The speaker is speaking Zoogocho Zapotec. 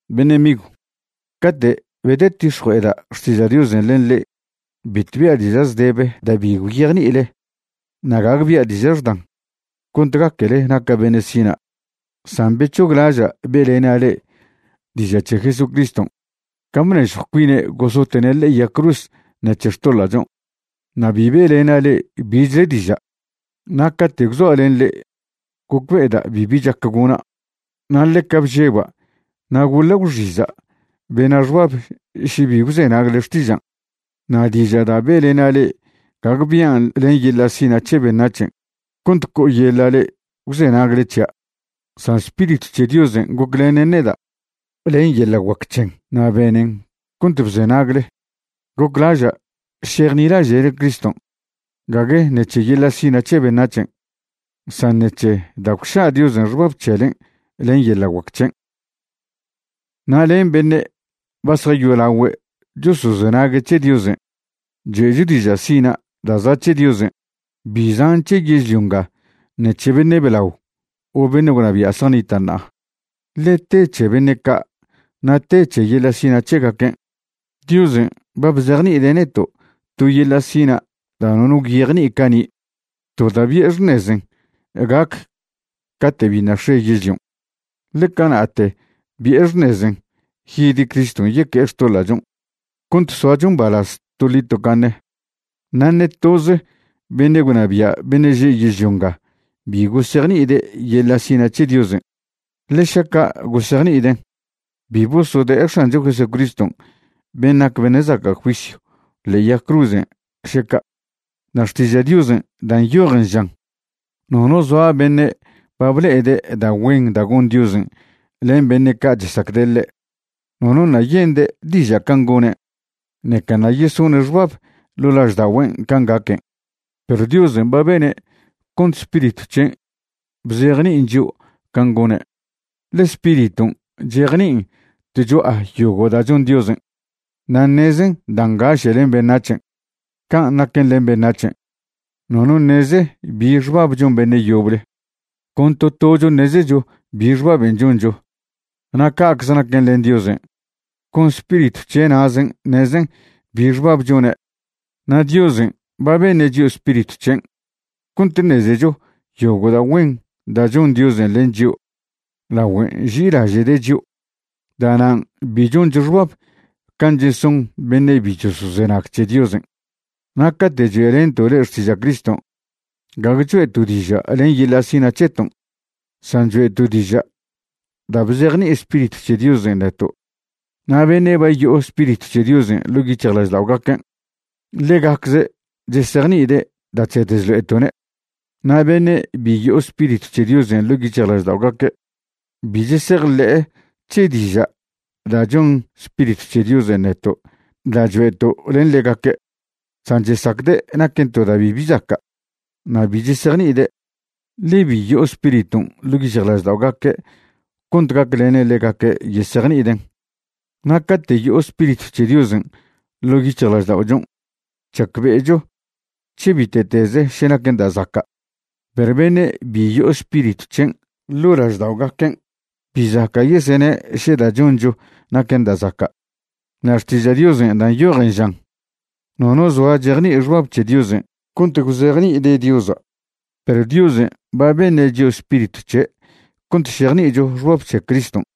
Beṉe' migw, cate' bedetix̱jue'eda' xtiža' Diosen' len le'e, bitw bia' diža' zdebe da' bi gwyejni'ile na' gague bia' diža' xdan cont gaquele naca' beṉe' sina'. San bec̱hoglaža' be'lena' le'e diža' c̱he Jesucriston' can' bnežjw cuine' gosote'ne' ḻe'e yag cruz ṉec̱he xtoḻa'chon', na' bi be'lena' le'e bichle diža'. Na' cate' gwzoa' len le'e gocbe'eda' bibi chac gona', na' ḻeca bžeba' na' goḻa' gwxiza' bena' xbab še bi gwzenagle xtižan'. Na' diža' da' be'lena' le'e gague bian' len yeḻa' sina' c̱he beṉac̱hen' cont co'oyeḻa' le'e gwzenagle c̱hia', san Spiritw c̱he Diosen' goclenen neda' len yeḻa' guac c̱hen na' benen cont bzenagle. Goclaža' šejnilaže'le Criston' gague ṉec̱he yeḻa' sina' c̱he beṉac̱hen', san ṉec̱he da' gwša' Diosen' xbab c̱helen' len yeḻa' guac c̱hen'. Na' len beṉe' ba zjayolagüe' chosozenague' c̱he Diosen' choe'cho diža' sina' da' za' c̱he Diosen', bi zan' c̱he yežlio nga ṉe c̱he beṉe' blao o beṉe' gwnabia' zjanita' ṉa'a, ḻe te c̱he beṉe' ca' na' te c̱he yeḻa' sina' c̱hegaquen'. Diosen' ba bzejni'ide' neto' to yeḻa' sina' da' nono gwyejni'i cani', to da' bi'e xṉezen' gac cate' biṉa' x̱e yežlion', ḻe cana'te bi'e xṉezen' yid Criston' yeque'e xtoḻa'chon' cont soacho mbalaz toḻi tocaṉe. Na' ṉe toze beṉe' gwnabia' beṉe' že' yežlio nga bi gosejni'ide' yeḻa' sina' c̱he Diosen', ḻe šaca' gosejni'iden', bi bosode'e X̱ancho Jesucriston' ben' nac beṉe' zaca' juisyw ḻe'e yag cruzen' še ca'. Na' Xtiža' Diosen' da' nyojen žan: Nono zoa beṉe' ba ble'ede' da' güen da' gon Diosen' len beṉe' ca' chesacde' ḻe'. Nono ṉa' yende' diža' can' gone', ṉeca ṉa' yesone' xbab ḻo' lažda'ogüen' can' gaquen'. Perw Diosen' ba bene' cont Spiritw c̱hen' bzejni'in chio' can' gone', ḻe Spiriton' chejni'in tcho'a yogo' da' chon Diosen', na' ṉezen da' ngaše' len beṉac̱hen'. Can' naquen len beṉac̱hen', nono ṉeze bi xbab chon beṉe' yoble, con to tocho ṉezecho bi xbaben' choncho. Na' ca'cze naquen len Diosen', con Spiritw c̱he' na'zen' ṉezen bi xbab chone'. Na' Diosen' ba beṉe' chio' Spiritw c̱hen' cont ṉezecho yogo' da' güen da' chon Diosen' len chio' lagüe nži'ilaže'de' chio'. Da'nan' bi choncho xbab can' cheson beṉe' bi chosozenag c̱he Diosen'. Na' cate' choe'lento' le'e xtiža' Criston', gague choe'to' diža' len yeḻa' sina' c̱heton', san choe'to' diža' da' bzejni'i Spiritw c̱he Diosen' neto', na' beṉe' ba yo'o Spiritw c̱he Diosen' ḻo' yic̱hjlažda'ogaquen', ḻegacze' chesejni'ide' da' chsed chlo'eto'ne'. Na' beṉe' bi yo'o Spiritw c̱he Diosen' ḻo' yic̱hjlažda'ogaque' bi chesejḻe'e c̱he diža' da' choṉ Spiritw c̱he Diosen' neto' da' choe'to' len ḻegaque', san chesacde' naquen to da' bibi zaca'. Na' bi chesejni'ide', ḻe bi yo'o Spiriton' ḻo' yic̱hjlažda'ogaque' cont gaclenen ḻegaque' yesejni'iden'. Na' cate' yo'o Spiritw c̱he Diosen' ḻo' yic̱hjlažda'ochon' chacbe'echo c̱he bite'teze še naquen da' zaca', perw beṉe' bi yo'o Spiritw c̱hen' ḻo' lažda'ogaquen', bi zaca' yesene' še da' choncho naquen da' zaca'. Na' Xtiža' Diosen' da' nyojen žan: “Nono zoa chejni'i xbab c̱he Diosen' cont gwzejni'ide' Diosa'.” Perw Diosen' ba beṉe' chio' Spiritw c̱he' cont šejni'icho xbab c̱he Criston'.